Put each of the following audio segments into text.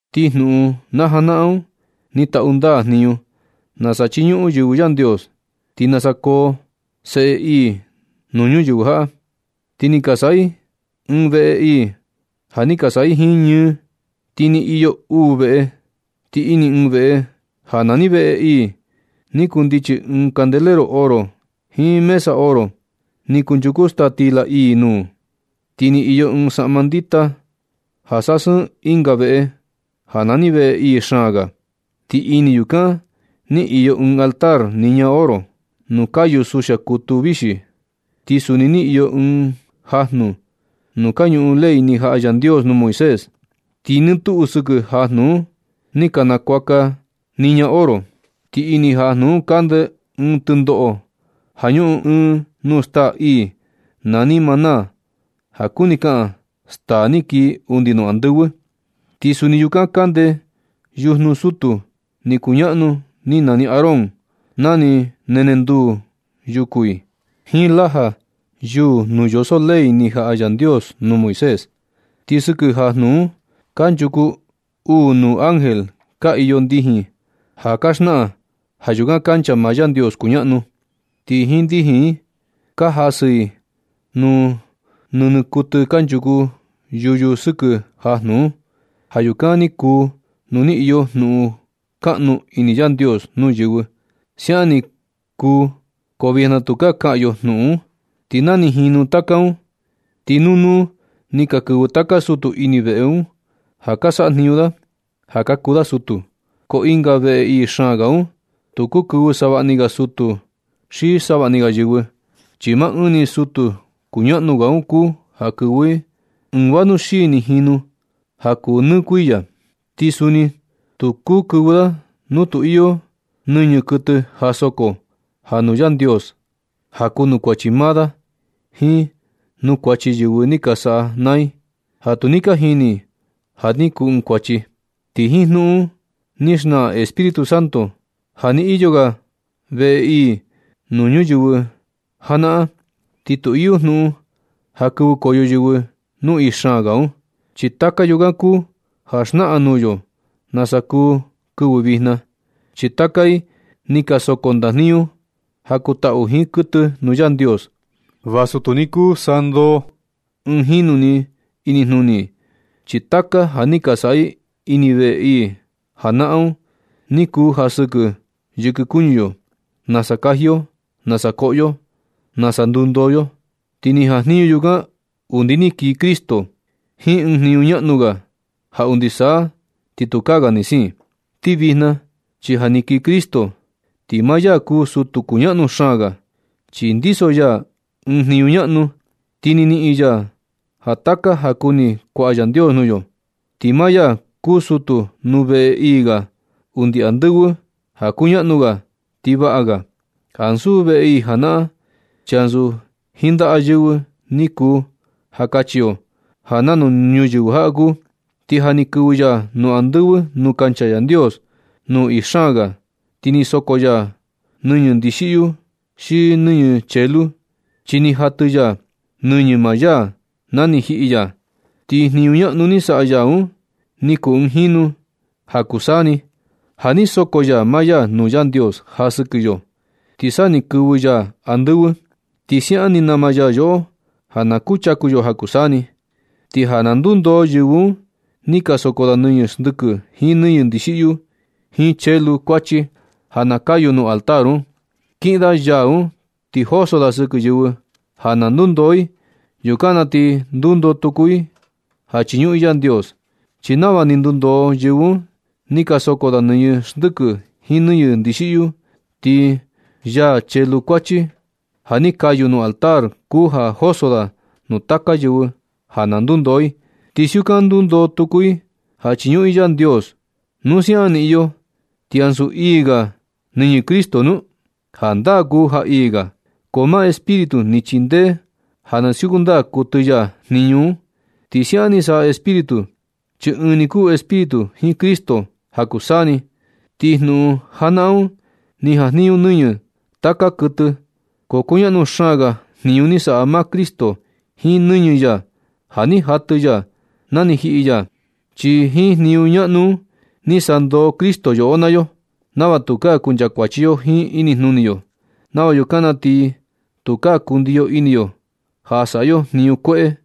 Ti jnuꞌun najanaꞌan un ni taꞌu ndaa jniñu nasa chiñuꞌun yɨvɨ Yandios, jiin nasa koo seꞌe ii nuu ñuyɨvɨ jaꞌa. Ti ni ka saꞌa i ɨɨn veꞌe ii ja ni ka saꞌa i jiin ñɨɨ, ti ni iyo uu veꞌe. Ti ini ɨɨn veꞌe ja nani veꞌe ii, ni kundichi ɨɨn candelero oro, jiin mesa oro ni kunchuku staa stila ii nuu. Ti ni iyo ɨɨn saꞌma ndita ja sasɨɨn ɨnga veꞌe ja nani veꞌe ii xaan ga. Ti ini yukan ni iyo ɨɨn altar niña oro, nuu kayu suxia kutu vixi. Ti suni ni iyo ɨɨn jajnu nuu kañuꞌun ley ni jaꞌa Yandios nuu Moisés, ti nɨ tuꞌu sɨkɨ jajnu un ni ka nakuaka i niña oro, ti ini jajnu un kande ɨɨn tɨndoꞌo ja ñuꞌun ɨɨn nuu staa ii nani maná ja kuni kaꞌan staa ni kii undi nuu andɨvɨ. Ti suni yukan kande yujnu sutu ni kuñaꞌnu ni nani Aarón ja ni nenenduu yuku i, jiin laja yuu nuu yoso ley ni jaꞌa Yandios nuu Moisés. Ti sɨkɨ jajnu un kanchuku uu nuu ángel ka iyo ndijin ja ka xnaꞌan ja yukan kancha maa Yandios kuñaꞌnu. Ti jiin ndijin i un ka jasɨ i nuu nɨñɨ kuɨtɨ kanchuku yuyu sɨkɨ jajnu un, ja yukan ni kuu nuu ni iyo jnuꞌun kaꞌnu ini Yandios nuu yɨvɨ. Siaꞌan ni kuu ko vijna tukaa kaꞌan yo jnuꞌun un. Ti na ni jinu taka un, ti nuu nuu ni ka kɨvɨ taka sutu ini veꞌe un ja ka saꞌa jniñu da ja ka kuu da sutu. Ko ɨnga veꞌe ii xaan ga un, tu kuu kɨvɨ savaꞌa ni ga sutu xi savaꞌa ni ga yɨvɨ. Chi maa ɨɨn ni sutu kuñaꞌnu ga un kuu ja kɨvɨ ɨɨn vanuxi ni jinu ja kuu nɨ kuiya. Ti suni tu kuu kɨvɨ da nu tu iyo nɨñɨ kuɨtɨ ja soko ja nuu Yandios ja kuu nuu kuachi maa da jiin nuu kuachi yɨvɨ ni ka saꞌa naa i, ja tu ni ka jini i ja ni kuu ɨɨn kuachi. Ti jiin jnuꞌun un ni xnaꞌan Espíritu Santo ja na ni iyo ga veꞌe ii nuu ñuyɨvɨ janaꞌan, ti tu iyo jnuꞌun ja kɨvɨkoyo yɨvɨ nuu ii xaan ga un. Chi taka yukan kuu ja xnaꞌan nuu yo nasa kuu kɨvɨ vijna. Chi taka i ni ka soko ndajniñu ja kuu taꞌu jiin kuɨtɨ nuu Yandios, vasu tu ni kuu sandoo ɨɨn jinu ni inijnuni i. Chi taka ja ni ka saꞌa i ini veꞌe ii janaꞌan un, ni kuu ja sɨkɨ yɨkɨ kuñu yo, nasa kaji yo, nasa koꞌo yo, nasa ndundoo yo. Ti ni jajniñu yukan undi ni kii Cristo jiin ɨɨn jniñu ñaꞌnu ga, ja undi sa ti tukaa ga ni siin. Ti vijna chi ja ni kii Cristo, ti maa ya kuu sutu kuñaꞌnu xaan ga, chi ndiso ya ɨɨn jniñu ñaꞌnu, ti ni niꞌin ya ja taka ja kuni kuaꞌa Yandios nuu yo. Ti maa ya kuu sutu nuu veꞌe ii ga undi andɨvɨ ja kuñaꞌnu ga ti vaꞌa ga, ansu veꞌe ii janaꞌan, chi ansu jiin ndaꞌa yɨvɨ ni kuu ja kachi yo ja nanu ñuyɨvɨ jaꞌa kuu. Ti ja ni kɨvɨ ya nuu andɨvɨ nuu kancha Yandios nuu ii xaan ga, tu ni soko ya nɨñɨ ndixiꞌyu xi nɨñɨ chelu, chi ni jatɨ ya nɨñɨ maa ya na ni jiꞌi ya. Ti jniñu ñaꞌnu ni saꞌa ya un ni kuu ɨɨn jinu ni ja kuu saa ni, ja ni soko ya maa ya nuu Yandios ja sɨkɨ yo, ti sa ni kɨvɨ ya andɨvɨ. Ti siaꞌan ni nama ya yoꞌo ja na kuchaku yo ja kuu saa ni. Ti ja na nundoo yɨvɨ un ni ka soko da nɨñɨ xndɨkɨ jiin nɨñɨ ndixiꞌyu, jiin chelu kuachi ja na kayu nuu altar un, kiꞌin da yaa un ti joso da sɨkɨ yɨvɨ ja na ndundoo i. Yukan na ti ndundoo tuku i ja chiñuꞌun i Yandios. Chi nava na ndundoo yɨvɨ un ti ka soko da nɨñɨ xndɨkɨ jiin nɨñɨ ndixiꞌyu, ti yaa chelu kuachi ja ni kayu nuu altar kuu ja joso da nuu taka yɨvɨ ja na ndundoo i, ti siukan ndundoo tuku i ja chiñuꞌun i Yandios. ¿Nu siaꞌan ni iyo, ti ansu ii ga nɨñɨ Cristo nu? Jandaa kuu ja ii ga, ko maa Espíritu ni chindee ja na siuku ndaa kuɨtɨ ya jniñu un, ti siaꞌan ni saꞌa Espíritu, chi ɨɨn ni kuu Espíritu jiin Cristo ja kuu saa ni. Ti jnuꞌun janaꞌan un ni jajniñu nɨñɨ taka kuɨtɨ. Ko kuñaꞌnu xaan ga jniñu ni saꞌa maa Cristo jiin nɨñɨ ya ja ni jatɨ ya na ni jiꞌi ya, chi jiin jniñu ñaꞌnu un ni sandoo Cristo yoꞌo naa yo nava tukaa kuncha kuachi yo jiin inijnuni yo, nava yukan na ti tukaa kundiyo ini yo ja saꞌa yo jniñu kueꞌe,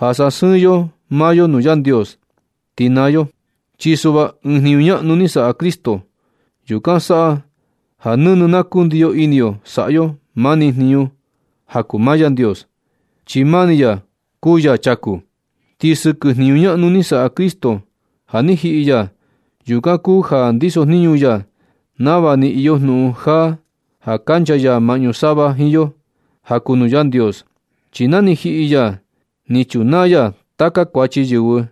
ja sasɨɨn yo maa yo nuu Yandios, ti naa yo. Chi suꞌva ɨɨn jniñu ñaꞌnu ni saꞌa Cristo. Yukan saꞌa ja nɨnɨ na kundiyo ini yo saꞌa yo mani jniñu ja kuu nuu maa Yandios, chi maa ni ya kuu Ya chaku. Ti sɨkɨ jniñu ñaꞌnu ni saꞌa Cristo ja ni jiꞌi ya, yukan kuu ja ndisojniñu ya nava ni iyo jnuꞌun jaa ja kancha ya maꞌñu sava jiin yo ja kuu nuu Yandios. Chi na ni jiꞌi ya ni chunaa ya taka kuachi yɨvɨ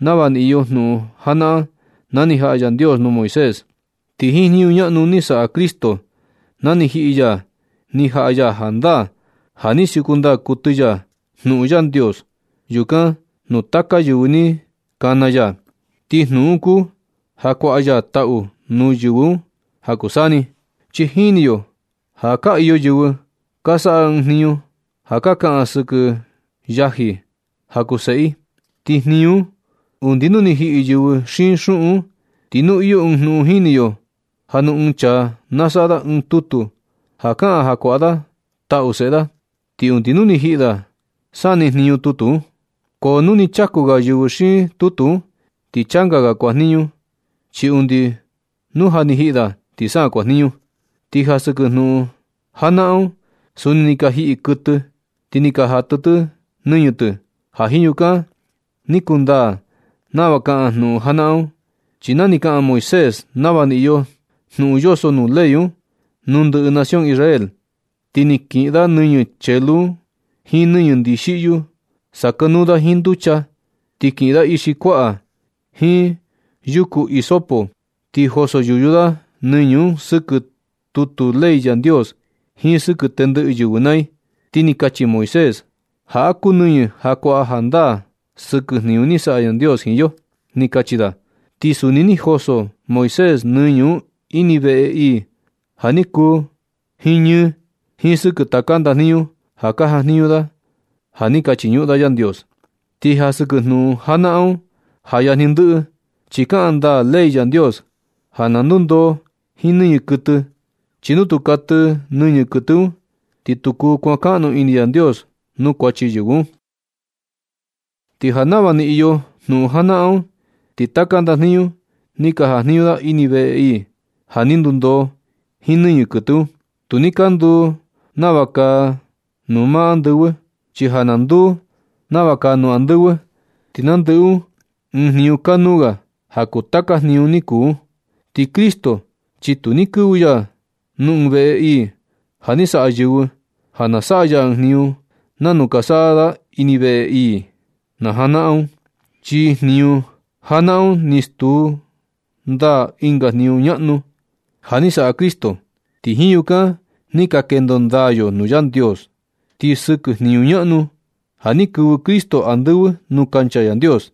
nava ni iyo jnuꞌun janaꞌan ja ni jaꞌa Yandios nuu Moisés. Ti jiin jniñu ñaꞌnu ni saꞌa Cristo na ni jiꞌi ya ni jaꞌa ya jandaa ja ni siuku ndaa kuɨtɨ ya jnuꞌun Yandios yukan nuu taka yɨvɨ ja kana ya, ti jnuꞌun un kuu ja kuaꞌa ya taꞌu nuu yɨvɨ un ja kuu saa ni. Chi jini yo ja ka iyo yɨvɨ ka saꞌa ɨɨn jniñu ja ka kaꞌan sɨkɨ yaji ja kuu seꞌe i, ti nijniñu un undi nu ni jiꞌi yɨvɨ xiin ñuꞌun un. Ti nu iyo ɨɨn jnuꞌun, jini yo ja nu ɨɨn chaa na saꞌa da ɨɨn tutu ja kaꞌan ja kuaꞌa da taꞌu seꞌe da, ti undi nuu ni jiꞌi da, sa niꞌin jniñu tutu un. Ko nu ni chaku ga yɨvɨ xiin tutu un, ti changa ga kuajniñu, chi undi nu ja ni jiꞌi da, ti sa kuajniñu. Ti ja sɨkɨ jnuꞌun janaꞌan un, suni ni ka jiꞌi kuɨtɨ, ti ni ka jatɨ tɨ nɨñɨ tɨ, ja jiin yukan ni kundaa nava kaꞌan jnuꞌun janaꞌan un. Chi na ni kaꞌan Moisés nava ni iyo jnuꞌun yoso nuu ley un nuu ndɨꞌɨ nación Israel, ti ni kiꞌin da nɨñɨ chelu un jiin nɨñɨ ndixiꞌyu, sakanuu da jiin nducha, ti kiꞌin da ixi kuaꞌa, jiin yuku hisopo ti joso yuyu da nɨñɨ un sɨkɨ tutu ley Yandios jiin sɨkɨ tendɨꞌɨ yɨvɨ naa i. Ti ni kachi Moisés: “Jaꞌa kuu nɨñɨ ja kuaꞌa jandaa sɨkɨ jniñu ni saꞌa Yandios jiin yo”, ni kachi da. Ti suni ni joso Moisés nɨñɨ un ini veꞌe ii ja ni kuu jiin ñɨɨ, jiin sɨkɨ taka ndajniñu ja ka jajniñu da ja ni ka chiñuꞌun da Yandios. Ti ja sɨkɨ jnuꞌun janaꞌan un, ja yajni ndɨꞌɨ, chi kaꞌan ndaa ley Yandios ja na ndundoo jiin nɨñɨ kuɨtɨ. Chi nu tu katɨ nɨñɨ kuɨtɨ un, ti tu kuu kuankaꞌnu ini Yandios nuu kuachi yɨvɨ un. Ti ja nava ni iyo jnuꞌun janaꞌan un, ti taka ndajniñu ni ka jajniñu da ini veꞌe ii, ja ni ndundoo jiin nɨñɨ kuɨtɨ un, tu ni ka nduu nava kaa nuu maa andɨvɨ. Chi ja na nduu nava kaa nuu andɨvɨ, ti nandɨꞌɨ un ɨɨn jniñu kanuu ga ja kuu taka jniñu ni kuu un. Ti Cristo chi tu ni kɨvɨ ya nuu ɨɨn veꞌe ii ja ni saꞌa yɨvɨ, ja na saꞌa ya ɨɨn jniñu nanu ka saꞌa da ini veꞌe ii un najanaꞌan un. Chi jniñu janaꞌan un ni stuu ndaa ɨnga jniñu ñaꞌnu ga ja ni saꞌa Cristo, ti jiin yukan ni ka kendo ndaa yo nuu Yandios. Ti sɨkɨ jniñu ñaꞌnu un, ja ni kɨvɨ Cristo andɨvɨ nuu kancha Yandios,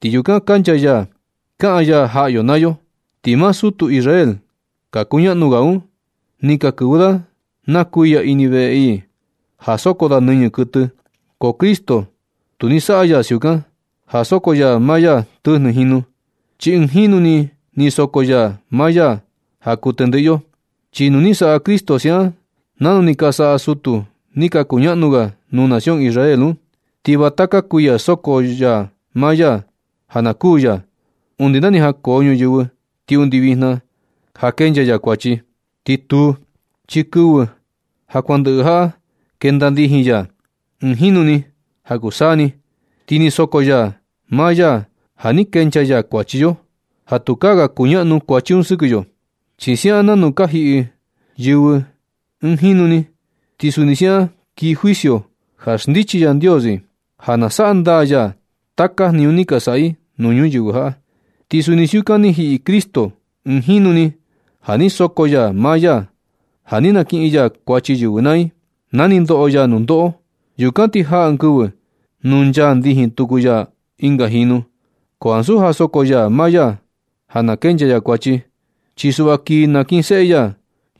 ti yukan kancha ya kaꞌan ya jaꞌa yo naa yo. Ti maa sutu Israel ka kuñaꞌnu ga un ni ka kɨvɨ da naa kuiya ini veꞌe ii ja soko da nɨñɨ kuɨtɨ. Ko Cristo tu ni saꞌa ya siukan, ja soko ya maa ya tɨjnɨ jinu, chi ɨɨn jinu ni ni soko ya maa ya ja kuu tendɨꞌɨ yo. Chi nu ni saꞌa Cristo siaꞌan nanu ni ka saꞌa sutu ni ka kuñaꞌnu ga nuu nación Israel un, ti va taka kuiya soko ya maa ya ja na kuū ya, undi na ni jankoo ñuyɨvɨ ti undi vijna ja kenchaa ya kuachi. Ti tuu, chi kɨvɨ ja kuan ndɨꞌɨ jaꞌa ni kenda ndijin ya ɨɨn jinu ni ja kuu saa ni, ti ni soko ya maa ya ja ni kenchaa ya kuachi yo, ja tukaa ga kuñaꞌnu kuachi un sɨkɨ yo. Ti siaꞌan nanu ka jiꞌi yɨvɨ ɨɨn jinu ni, ti suni siaꞌan kii juicio ja xndichi Yandios i, ja na saꞌa ndaa ya taka jniñu ni ka saꞌa i nuu ñuyɨvɨ jaꞌa, ti suni siukan ni jiꞌi Cristo ɨɨn jinu ni ja ni soko ya maa ya ja ni nakiꞌin ya kuachi yɨvɨ naa i na ni ndoꞌo ya nundoꞌo. Yukan ti jaa ɨɨn kɨvɨ nu nchaa ndijin tuku ya ɨnga jinu, ko ansu ja soko ya maa ya ja na kenchaa ya kuachi, chi sa suꞌva kii nakinseꞌe ya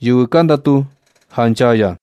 yɨvɨ ka ndatu ja nchaa ya.